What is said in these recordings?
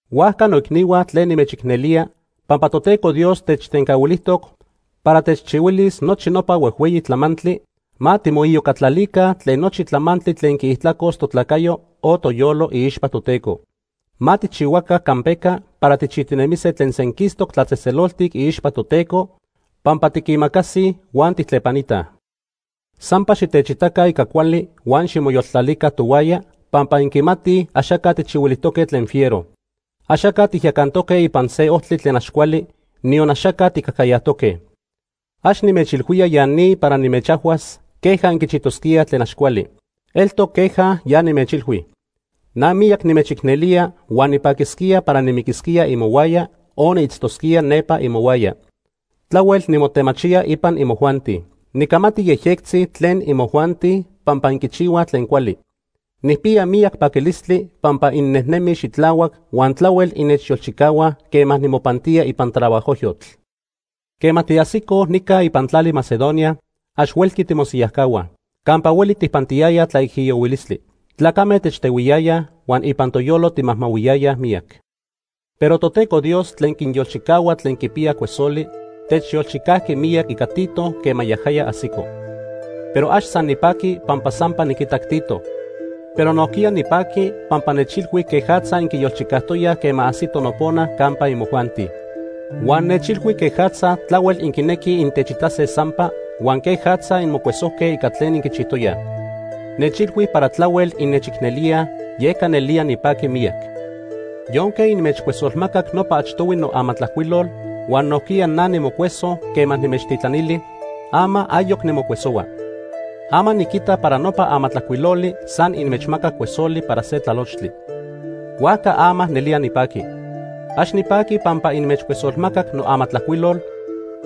Huajca noicnihua tlen nimechicnelía, pampa Toteco Dios techtencahuilijtoc para techchihuilis nochi nopa huejhueyi tlamantli, ma timoiyocatlalica tlen nochi tlamantli tlen quiijtlacos totlacayo o toyolo iixpa Toteco. Ma tijchihuaca campeca para tijchijtinemise tlen senquistoc tlatzejtzeloltic iixpa Toteco pampa tiquimacasij huan tijtlepanitaj. Sampa xitechitaca ica cuali huan ximoyoltlalica tohuaya pampa inquimatij axaca tijchihuilijtoque tlen fiero. Axaca tijyacantoque ipan se ojtli tlen ax cuali, niyon axaca tijcajcayajtoque. Ax nimechilhuía ya ni para nimechajhuas queja inquichijtosquíaj tlen ax cuali. Eltoc queja ya nimechilhui. Na miyac nimechicnelía huan nipaquisquía para nimiquisquía imohuaya o niitztosquía nepa imohuaya. Tlahuel nimotemachía ipan imojuanti. Nicamati yejyectzi tlen imojuanti pampa inquichihuaj tlen cuali. Nijpiya miyac paquilistli pampa innejnemij xitlahuac huan tlahuel innechyolchicahuaj quema nimopantía ipan trabajojyotl. Quema tiajsicoj nica ipan tlali Macedonia, ax huelqui timosiyajcahuaj. Campa hueli tijpantiyayaj tlaijiyohuilistli. Tlacame techtehuiyayaj huan ipan toyolo timajmahuiyayaj miyac. Pero Toteco Dios tlen quinyolchicahua tlen quipiyaj cuesoli, techyolchicajqui miyac ica Tito quema yajaya ajsico. Pero ax san nipajqui pampa sampa niquitac Tito, pero nojquiya nipajqui pampa nechilhui quejatza inquiyolchicajtoyaj quema ajsito nopona campa imojuanti. Huan nechilhui quejatza tlahuel inquinequij intechitase sampa, huan quejatza inmocuesojque ica tlen inquichijtoyaj. Nechilhui para tlahuel innechicnelíaj, yeca nelía nipajqui miyac. Yonque inmechcuesolmacac nopa achtohui noamatlajcuilol, huan nojquiya na nimocueso quema nimechtitlanili, ama ayoc nimocuesohua. Ama niquita para nopa amatlajcuiloli san inmechmacac cuesoli para se tlalochtli. Huajca ama nelía nipaqui. Ax nipaqui pampa inmechcuesolmacac noamatlajcuilol,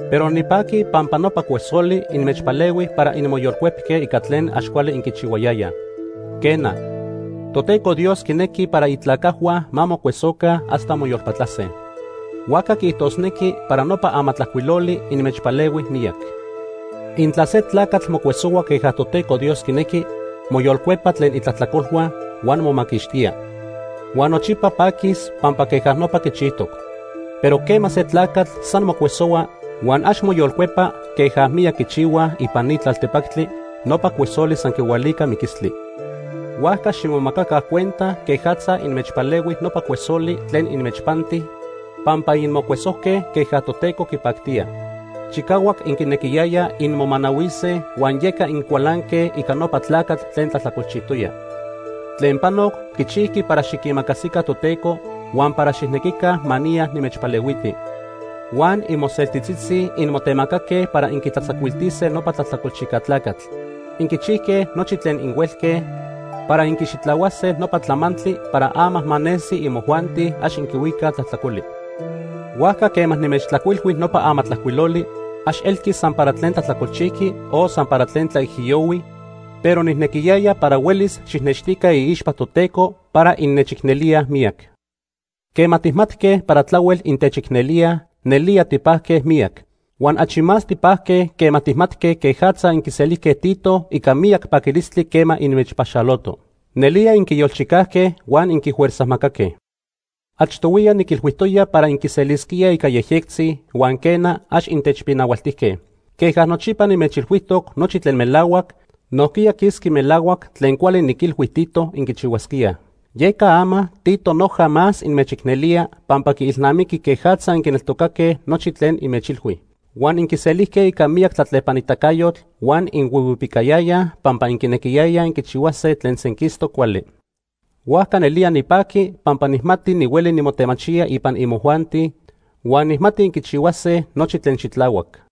pero nipaqui pampa nopa cuesoli inmechpalehui para inmoyolcuepque ica tlen ax cuali inquichihuayayaj. Quena, Toteco Dios quinequi para itlacajhua ma mocuesoca hasta moyolpatlase. Huajca quiijtosnequi para nopa amatlajcuiloli inmechpalehui miyac. Intla se tlacatl mocuesohua queja Toteco Dios quinequi, moyolcuepa tlen itlajtlacolhua, huan momaquixtía. Huan nochipa paquis pampa queja nopa quichijtoc. Pero quema se tlacatl san mocuesohua huan ax moyolcuepa queja miyac quichihuaj ipan ni tlaltepactli, nopa cuesoli san quihualica miquistli. Huajca ximomacaca cuenta quejatza inmechpalehui nopa cuesoli tlen inmechpanti pampa inmocuesojque queja Toteco quipactía. Chicahuac inquinequiyayaj inmomanahuise huan yeca incualanque ica nopa tlacatl tlen tlajtlacolchijtoya. Tlen panoc quichijqui para xiquimacasica Toteco huan para xijnequica ma niya nimechpalehuiti. Huan imoseltitzitzi inmotemacaque para inquitlatzacuiltise nopa tlajtlacolchijca tlacatl. Inquichijque nochi tlen inhuelque para inquixitlahuase nopa tlamantli para ama ma nesi imojuanti ax inquihuicaj tlajtlacoli. Huajca quema nimechtlajcuilhui nopa amatlajcuiloli, ax elqui san para tlen tlajtlacolchijqui o san para tlen tlaijiyohui, pero nijnequiyaya para huelis xijnextica iixpa Toteco para innechicnelíaj miyac. Quema tijmatque para tlahuel intechicnelíaj, nelía tipajque miyac. Huan achi más tipajque quema tijmatque quejatza inquiselijque Tito ica miyac paquilistli quema inmechpaxoloto. Nelía inquiyolchicajque huan inquifuerzajmacaque. Achtohuiya niquilhuijtoya para inquiselisquíaj ica yejyectzi, huan quena, ax intechpinahualtijque. Queja nochipa nimechilhuijtoc nochi tlen melahuac, nojquiya quisqui melahuac tlen cuali niquilhui Tito inquichihuasquíaj. Yeca ama Tito noja más inmechicnelía pampa quiilnamiqui quejatza inquineltocaque nochi tlen inmechilhui. Huan inquiselijque ica miyac tlatlepanitacayotl huan inhuihuipicayayaj pampa inquinequiyayaj inquichihuase tlen senquistoc cuali. Huajca nelía nipaqui pampa nijmati nihueli nimotemachía ipan imojuanti, huan nijmati inquichihuase nochi tlen xitlahuac.